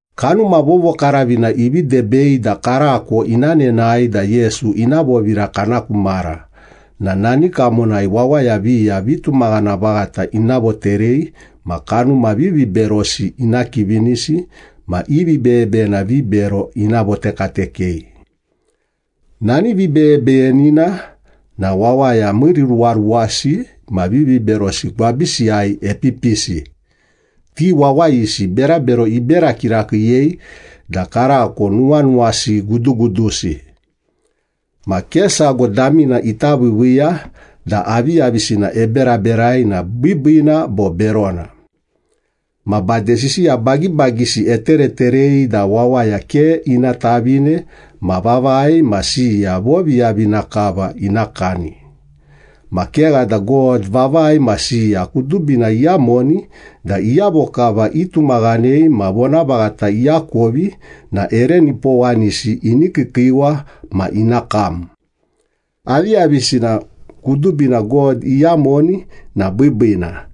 Kanuma Vovokaravina ivi debei da karako ina nenae da Yesu ina vovira kana ku mara na nani kamonai wawaya viya vitumaghana vaghata ina voterei ma kanuma viviberosi ina kivinisi ma i vibeyebeyena vibero ina votekatekei. Nani vibeyebeyenina na wawaya miiriruwaruwasi ma viviberosi gwabisiyai epipisi. Ti wawayisi berabero ibera kirakiiyei da karako nuwanuwasi gudugudusi. Ma ke sago damina ita viiviiya da aviyavisina eberaberai na biibiina bo berona. Ma bade sisiya bagibagisi etereterei da wawaya ke ina tavine ma vavai ma siya voviyavina kava ina kani. Ma kegha da God vavai ma siya kudubina iyamoni da iyavo kava itumaghanei ma vonavaghata iakovi na ere nipowanisi ini kiikiiwa ma ina kam. Aviyavisina kudubina God iyamoni na biibiina,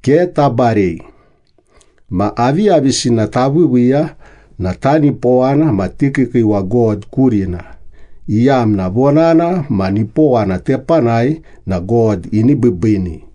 ke tabarei. Ma aviyavisina taviiviiya na tanipowana ma tikiikiiwa God kurina, iyamna vonana ma nipowana tepanai na God ini biibiini.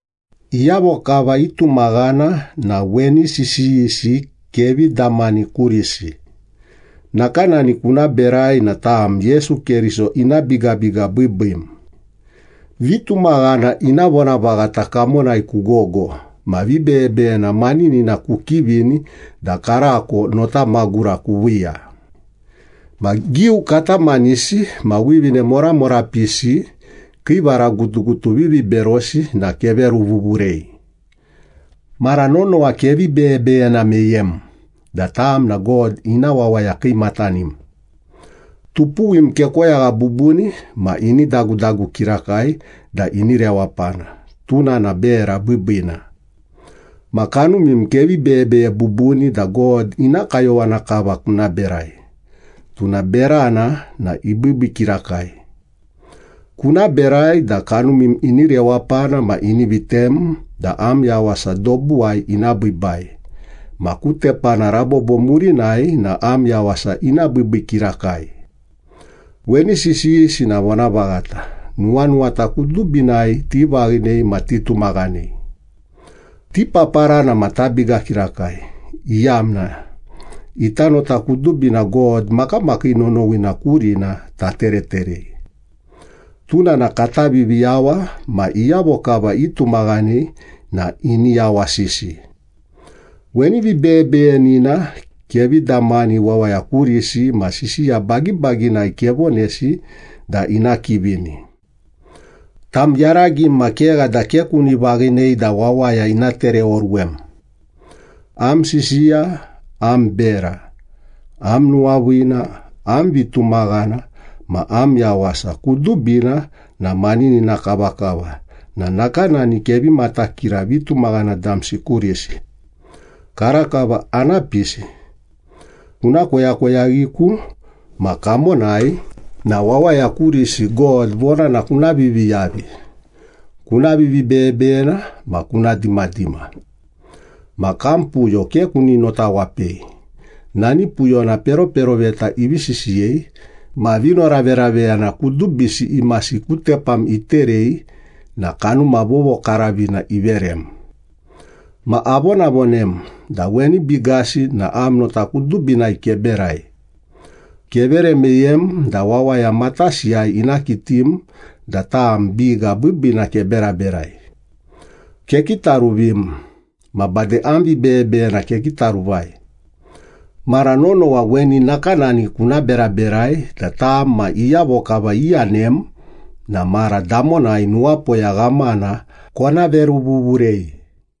Iyavo kava itumaghana na weni sisiyisi kevi damani kurisi. Nakanani kuna berai na tam Yesu Keriso ina bigabiga biibiim. Vitumaghana ina vonavaghata kamonai kugogo ma vibeyebeyena maninina kukivini da karako nota magura kuviiya. Ma giu katamanisi ma wivine moramorapisi kii varagutugutu viviberosi na keveruvuvurei. Mara nonowa kevi beyebeyena meyem da tam na God ina wawaya kiimatanim. Tupuwim kekoyagha bubuni ma ini dagudagu kirakai da ini rewapana, tuna na bera biibiina. Ma kanumim kevi beyebeye bubuni da God ina kayowana kava kuna berai, tuna berana na ibiibii kirakai. Kuna berai da kanumim ini rewapana ma ini vitem da am yawasa dobuwai ina biibai, ma ku tepana rabobo murinai na am yawasa ina biibii kirakai. Weni sisiyisi na vonavaghata, nuwanuwata kudubinai tivaghinei ma titumaghanei. Tipaparana ma tabiga kirakai, iyamna ita nota kudubina God makamakii nonowina kurina tatereterei. Tuna na kata Viviyawa ma iyavo kava itumaghanei na ini yawasisi. Weni vibeyebeyenina kevi damani wawaya kurisi ma sisiya bagibaginai kevonesi da ina kivini. Tam yaragim ma kegha da ke kuni vaghinei da wawaya ina tereoruwem. Am sisiya, am bera, am nuwaviina, am vitumaghana, ma am yawasa kudubina na maninina kavakava na nakanani kevi matakira vitumaghana damsi kurisi. Karakava ana pisi. Kuna koyakoyaghiku ma kamonai na wawaya kurisi God vonana kuna viviyavi, kuna vivibeyebeyena ma kuna dimadima. Ma kam puyo ke kuni notawapei, nani puyona peroperoveta ivivi sisiyei ma vinoraveraveyana kudubisi imasi ku tepam iterei na Kanuma Vovokaravina iverem. Ma avonavonem da weni bigasi na am nota kudubinai keberai. Kevere meyem da wawaya matasiyai ina kitim da tam biga biibiina keberaberai. Kekitaruvim, ma bade am vibeyebeyena kekitaruvai. Mara nonowa weni nakanani kuna beraberai da tam ma iyavo kava iyanem na mara damonai nuwapoya ghamana kona veruvuvurei.